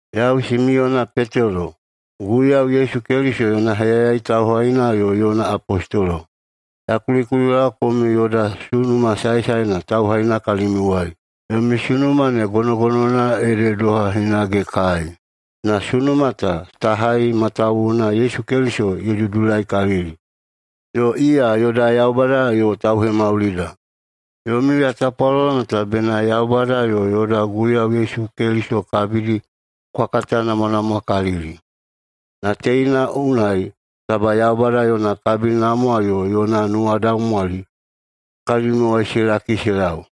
Yau Simiyona Petelo, Guiyau Yesu Keliso yona heyayai tauhaina yo yona apostolo. Ya kulikulilaowa komiu yoda sunuma saesaena tauhaina kalimiuwai. Yomi sunuma ne gonogonowana ede doha hinage kai, na sunuma ta ta hai matawuwuna Yesu Keliso ye dudulaikalili, yo iya yoda Yaubada yo Tauhemaulida. [Yomiu ya tapwalolo meta] bena Yaubada yo yoda Guiyau Yesu kabidi kwa katanamwanamwakalili, na teina unai taba Yaubada yona kabinamwa yo yona nuwadaumwali kalimiuwai se laki se lau.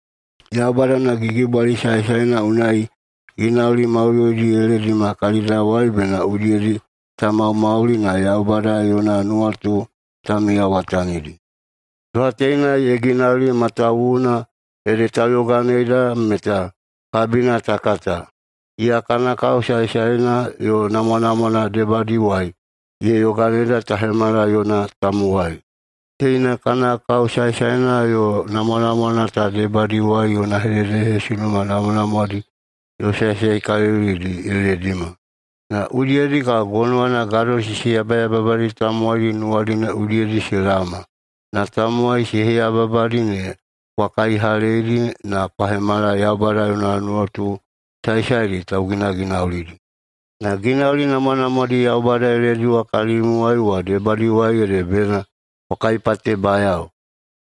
Yaubada yona gigibwali saesaena unai ginauli maudoidi ye ledima kalidawai bena udiyedi ta maumauli na Yaubada yona nuwatu ta miyawatanidi. Doha teina ye ginauli, matawuwuna ede tauyoganeida meta kabina ta kata. Iya kana kao saesaena yo namwanamwana debadiwai ye yoganeida ta hemala yona tamowai. Teina kana kao saesaena yo namwanamwana ta debadiwai yona hededehesunuma namwanamwadi yo saesaekalilidi ye ledima, na udiyedi kabo gonowana gadosisi yabayababadi tamowai nuwadi ne udiyedi se laoma na tamowai se heyababadi ne kwa kaihaleidi na kwa hemala Yaubada yona nuwatu saesaedi tauginaginaulidi. Na ginauli namwanamwadi Yaubada ye lediwa kalimiuwai wa debadiwai ede bena kwa kaipatebayao,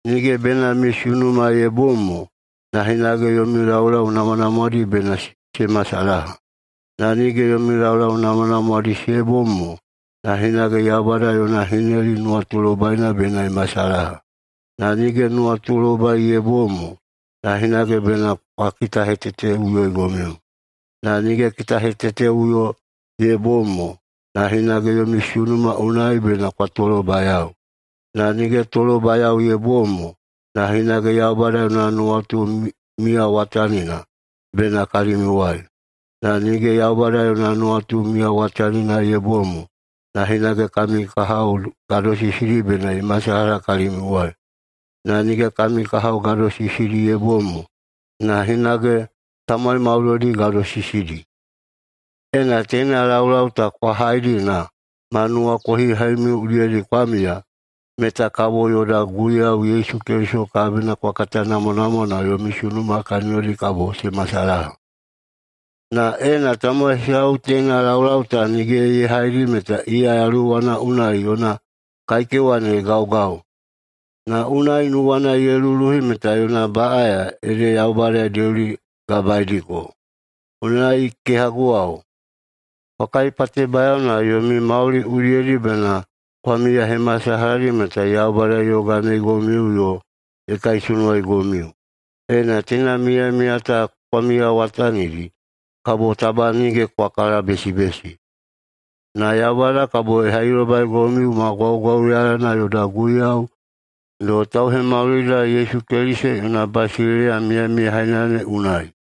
nige bena yomi sunuma ye bom mo, na hinage yomi laulau namwanamwadi [bena se masalaha]. Na nige yomi laulau namwanamwadi se bom mo, na hinage Yaubada yona hineli nuwatulobaina [bena ye masalaha]. Na nige nuwatulobai ye bom mo, na hinage bena kwa kitaheteteꞌuyoigomiu. Na nige kitaheteteꞌuyo ye bom mo, na hinage yomi sunuma unai bena kwa tolobayao. Na nige tolobayao ye bom mo, na hinage Yaubada yona nuwatu miyawatanina bena kalimiuwai. Na nige Yaubada yona nuwatu miyawatanina ye bom mo, na hinage kami kahao gadosisidi bena ye masalaha kalimiuwai. Na nige kami kahao gadosisidi ye bom mo, na hinage tamowai maudoidi gadosisidi. Ena teina laulau ta kwa haidi na ma nuwakohihaimiu udiyedi kwa miya, meta kabo yoda Guiyau Yesu Keliso kabina kwa katanamwanamwa na yomi sunuma kaniyodi kabo se masalaha. Na ena tamowai hesau teina laulau ta nige ye haidi meta iya yaluwana unai yona kaikewa ne ye gaugau, na unai nuwana ye luluhi meta yona baꞌaya ede Yaubada ye deuligabaediko. Unai, kehaguwao, kwa kaipatebayao na yomi mauli udiyedi bena kwa miyahemasalaha meta Yaubada ye yoganeigomiu yo ye kaisunuwaigomiu. Ena teina miyamiya ta kwa miyawatanidi, kabo taba nige kwa kalabesibesi. Na Yaubada kabo ye hailobaigomiu ma gwaugwauyalana yoda Guiyau yo Tauhemaulida Yesu Keliso yona basileiya miyamiyahaina ne unai.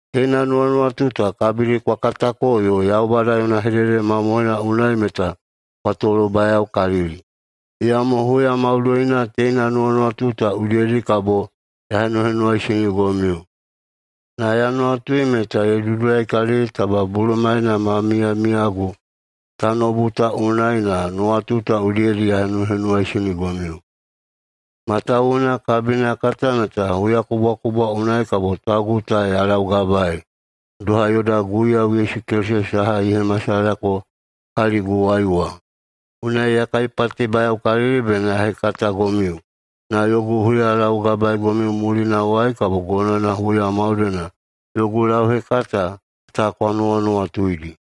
Teina nuwanuwatu ta kabidi kwa katako yo Yaubada yona hedehedede mamohoina unai meta kwa tolobayaokalili. Iyamo huya maudoina teina nuwanuwatu ta udiyedi kabo ya henuhenuwaisinigomiu. Na ya nuwatui meta ye dudulaikalili taba bulumaena ma miyamiyagu tanoubu ta unai na nuwanuwatu ta udiyedi ya henuhenuwaisinigomiu. Matawuwuna kabina ya kata meta huyakubwakubwa unai kabo taugu ta ya laugabaei, doha yoda Guiyau Yesu Keliso saha ye hemasalahayako kaliguwai wa. Unai ya kaipatebayaokalili bena ya hekatagomiu, na yogu huyalaugabaegomiu mulinawai kabo gonowana huya maudoina yogu lauhekata ta kwa nuwanuwatuidi.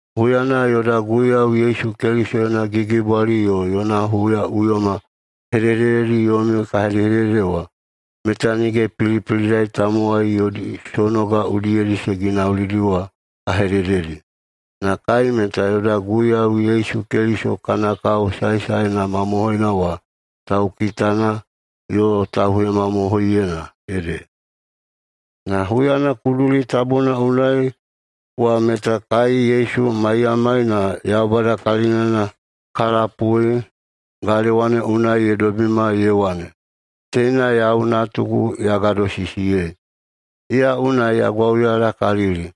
Huyana yoda Guiyau Yesu Keliso yona gigibwali yo yona huyaꞌuyoma hedehedededi yomiu ka hedehedede wa, meta nige pilipilidai tamowai yodi sonoga udiyedi se ginaulidi wa ka hedededi. Na kai meta yoda Guiyau Yesu Keliso kana kao saesaena mamohoina wa taukitana yo tauhemamohoiyeina ede. Na huyana kuduli tabuna unai wa meta kai Yesu maiyamai na Yaubada kalinana ka lapui galewa ne unai ye dobima ye wane, “Teina yau Natugu ya gadosisiyei. Iya unai ya gwauyalakalili.”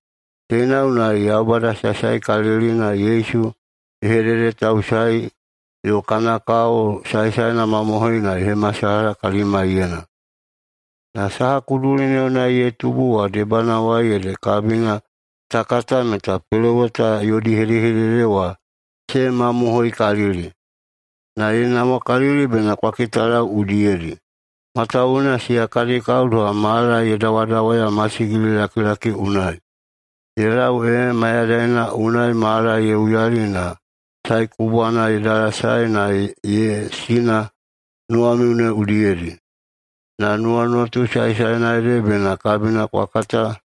Teina unai Yaubada Saesaekalilina Yesu ye hededetausaei yo kana kao saesaena mamohoina ye hemasalaha kalimaiyena. Na saha kuduli ne unai ye tubu wa debanawai ede kabina ta kata meta peloweta yodi hedehedede wa se mamohoikalili. Na ye namwakalili bena kwa kitalau udiyedi, matawuwuna siya kadi kao doha mala ye dawadawaya masigililakilaki unai. Ye lau ee Mayadaina unai mala ye uyali na Sae Kubwana ye dalasae na ye sina nuwamiu ne udiyedi. Na nuwanuwatu saesaena ede bena kabina kwa kata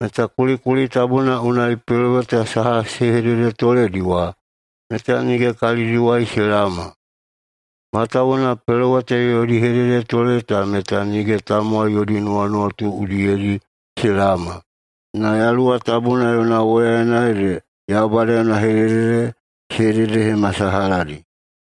meta kulikuli tabuna unai peloweta saha se hededetoledi wa meta nige kalidiwai se laoma. Matawuwuna peloweta yodi hededetole ta meta nige tamowai yodi nuwanuwatu udiyedi se laoma. Na Yaluwa Tabuna yona woyaena ede Yaubada yona hedehedede se hededehemasalahadi.